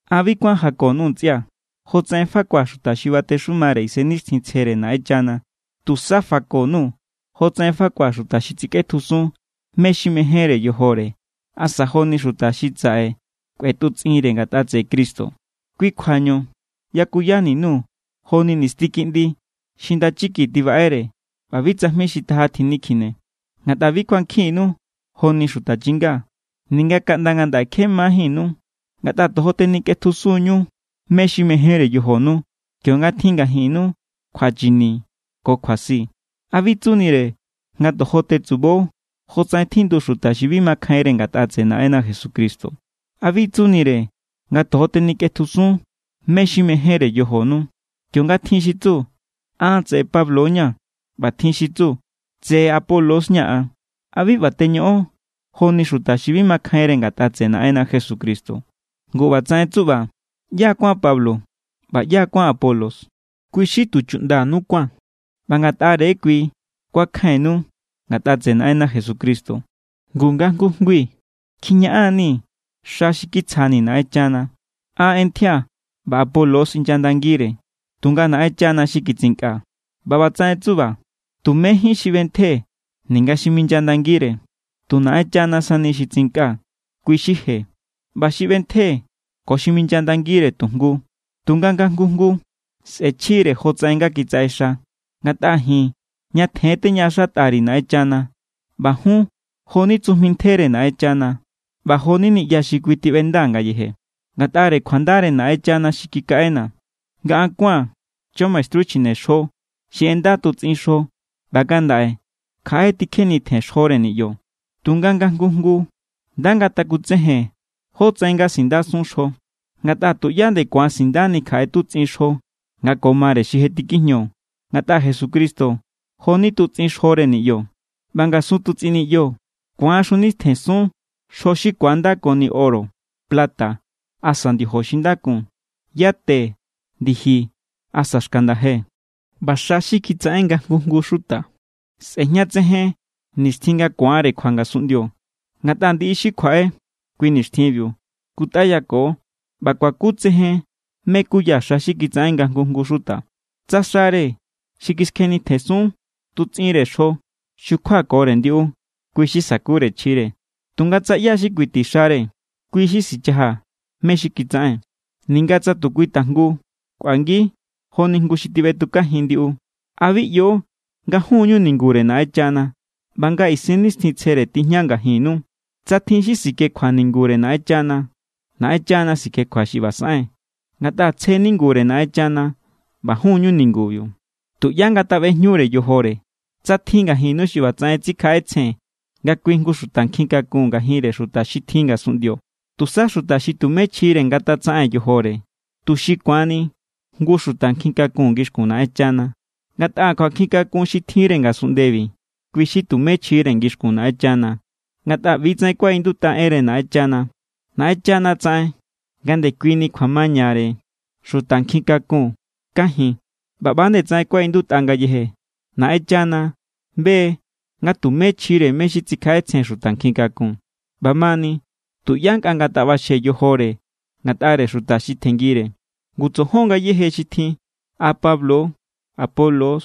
An bi kuán jako_nuu̱, ntsꞌia̱, jotsaꞌen fakua̱ xuta xi batexumare Isennixtjintsjere Naꞌenchana, tusa fako_nuu̱ jotsaꞌen fakua̱ xuta xi tsikꞌetjusun mé= xi mejénre yojore asa joni xuta xi saꞌe kꞌuetutsꞌinre ngatꞌa tseꞌe Cristo. Kui kjuañu yakuyani_nuu̱ joni nisti kiꞌndi xi ndachiki tibaꞌere ꞌba bi tsajmi xi taja tjinikjine. Ngatꞌa bi kuankjinnu joni xuta chinga, ninga kaꞌnda ngandaꞌe kje majínnu, ngatꞌa tojo tenikꞌetjusun=ñu mé= xi mejénre yojonu. Kionga tjin ngajinnu kjuachini ko kjuasi, ¿a bi tsunire nga tojo tetsubo jotsaꞌen tjindu xuta xi bi makjainre ngatꞌa tseꞌe Naꞌenna Jesucristo? ¿A bi tsunire nga tojo tenikꞌetjusun mé= xi mejénre yojonu? Kionga tjin xi tsu: “An tseꞌe Pablo= ña̱”, ꞌba tjin xi tsu: “Tseꞌe Apolos= ña̱ an”, ¿a bi ꞌba teñoꞌon joni xuta xi bi makjainre ngatꞌa tseꞌe Naꞌenna Jesucristo? Ngu ꞌbatsaꞌen tsuꞌba, ¿ꞌyá= kuán Pablo? ¿ꞌBa ꞌyá= kuán Apolos? Kui= xi tu chuꞌndanu kuán, ꞌba Ngatꞌare= kui kuakjainnu ngatꞌa tseꞌe Naꞌenna Jesucristo. Ngu nga jngui jngui kjiñaꞌan=nii̱ xa xi kitsjani̱ Naꞌenchana. An ꞌentjía̱, ꞌba Apolos inyandangire, tunga Naꞌenchana xi kitsinkꞌa. ꞌBa ꞌbatsaꞌen tsuꞌba, tumejín xi ꞌbentje ninga xi minyandangire. Tu Naꞌenchana sani xi tsinkꞌa, kui= xi je. ꞌBa xi ꞌbentje ko xi minyandangire tu jngu. Tunga nga jngu jngu sꞌe̱chjire jotsaꞌen nga kitsaꞌexa. Ngatꞌa ji̱n ñatjen= teñaꞌaxatꞌa_ri̱ Naꞌenchana. ꞌBa jun jo=ni tsujmi ntjere Naꞌenchana, ꞌba jo=ni niꞌya xi kui tiꞌbenda= ngayeje. Ngatꞌare kjuandare Naꞌenchana xi kikaꞌena̱, nga an kuáa̱n chamaestru chjinexjo xi ꞌenda tutsꞌin xjo. ꞌBa ngandaꞌe kjaꞌe= tikjenitjen xjore niꞌyo. Tunga nga jngu jngu nda ngatakutsejen jótsaꞌen nga sindasun xjo. Ngatꞌa tuꞌyá nde ku̱an sindani kjaꞌe tutsꞌin xjo nga ko mare xi je tikijño, ngatꞌa Jesucristo jo=ni tutsꞌin xjore niꞌyo. ꞌBa ngasun tutsꞌin niꞌyo ku̱an xjunitjensun xjo xi ku̱andakoni oro, plata, asa ndiojo xi nda kun, yate, ndiji, asa xka nda̱je. ꞌBa xa xi kitsaꞌen nga jngu jngu xuta sꞌe̱jñatsejen nixtjin nga ku̱anre kjua ngasunꞌndio. Ngatꞌa ndiꞌi xi kjuaꞌe kui nixtjinbiu skutꞌayako ꞌba kuakutsejen mé= kuya xa xi kitsaꞌen nga jngu jngu xuta. Tsa xare xi kiskjenitjensun tutsꞌinre xjo xukjuakore ndiꞌu, kui= xi sa̱kure chjire. Tunga tsa ꞌyá= xi kuiti xare, kui= xi sichaja mé= xi kitsaꞌen, ninga tsa tu kui tajngu kꞌuangi joni jngu xi tiꞌbetukajin ndiꞌu. ¿A bi ꞌyo nga jun= ñu ningure Naꞌenchana ꞌba nga Isennixtjintsjere tijña ngajinnu? Tsa tjin xi sikjekjua ningure Naꞌenchana, Naꞌenchana sikjekjua xi ꞌba saꞌen. Ngatꞌa tsje ningure Naꞌenchana, ꞌba jun= ñu ningubiu. Tuꞌyá ngataꞌbejñure yojore. Tsa tjin ngajinnu xi ꞌbatsaꞌen tsikjaꞌetsjen nga kui jngu xuta nkjin kakun ngajinre xuta xi tjin ngasunꞌndio, tusa xuta xi tumé chjire ngatatsaꞌen yojore, tuxi ku̱anni jngu xuta nkjin kakun ngixkun Naꞌenchana. Ngatꞌa kjuankjin kakun xi tjinre ngasunꞌndebi, kui= xi tumé chjire ngixkun Naꞌenchana. Ngatꞌa ꞌbi= tsaꞌen kuaꞌindutꞌa enre Naꞌenchana: “Naꞌenchana tsaꞌen nga ndekuini kjuamañare xuta nkjin kakun kajin.” ꞌBa ꞌba=nde tsaꞌen kuaꞌindutꞌa ngayeje: “Naꞌenchana be= nga tumé chjire mé= xi tsikjaꞌetsjen xuta nkjin kakun.” ꞌBamani, tuꞌyá nkꞌa ngataꞌbaxje yojore ngatꞌare xuta xi tjenngire. Ngu tsojon ngayéje xi tjin. A Pablo=, Apolos=,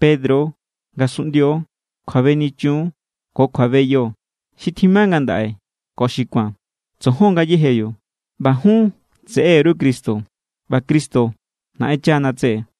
Pedro=, ngasunꞌndio=, kjuabenichun= ko kjuabeyo, xi tjima ngandaꞌe ko xi ku̱an; tsojon ngayéjebiu. ꞌBa jun tseꞌeru Cristo, ꞌba Cristo Naꞌenchana tseꞌe.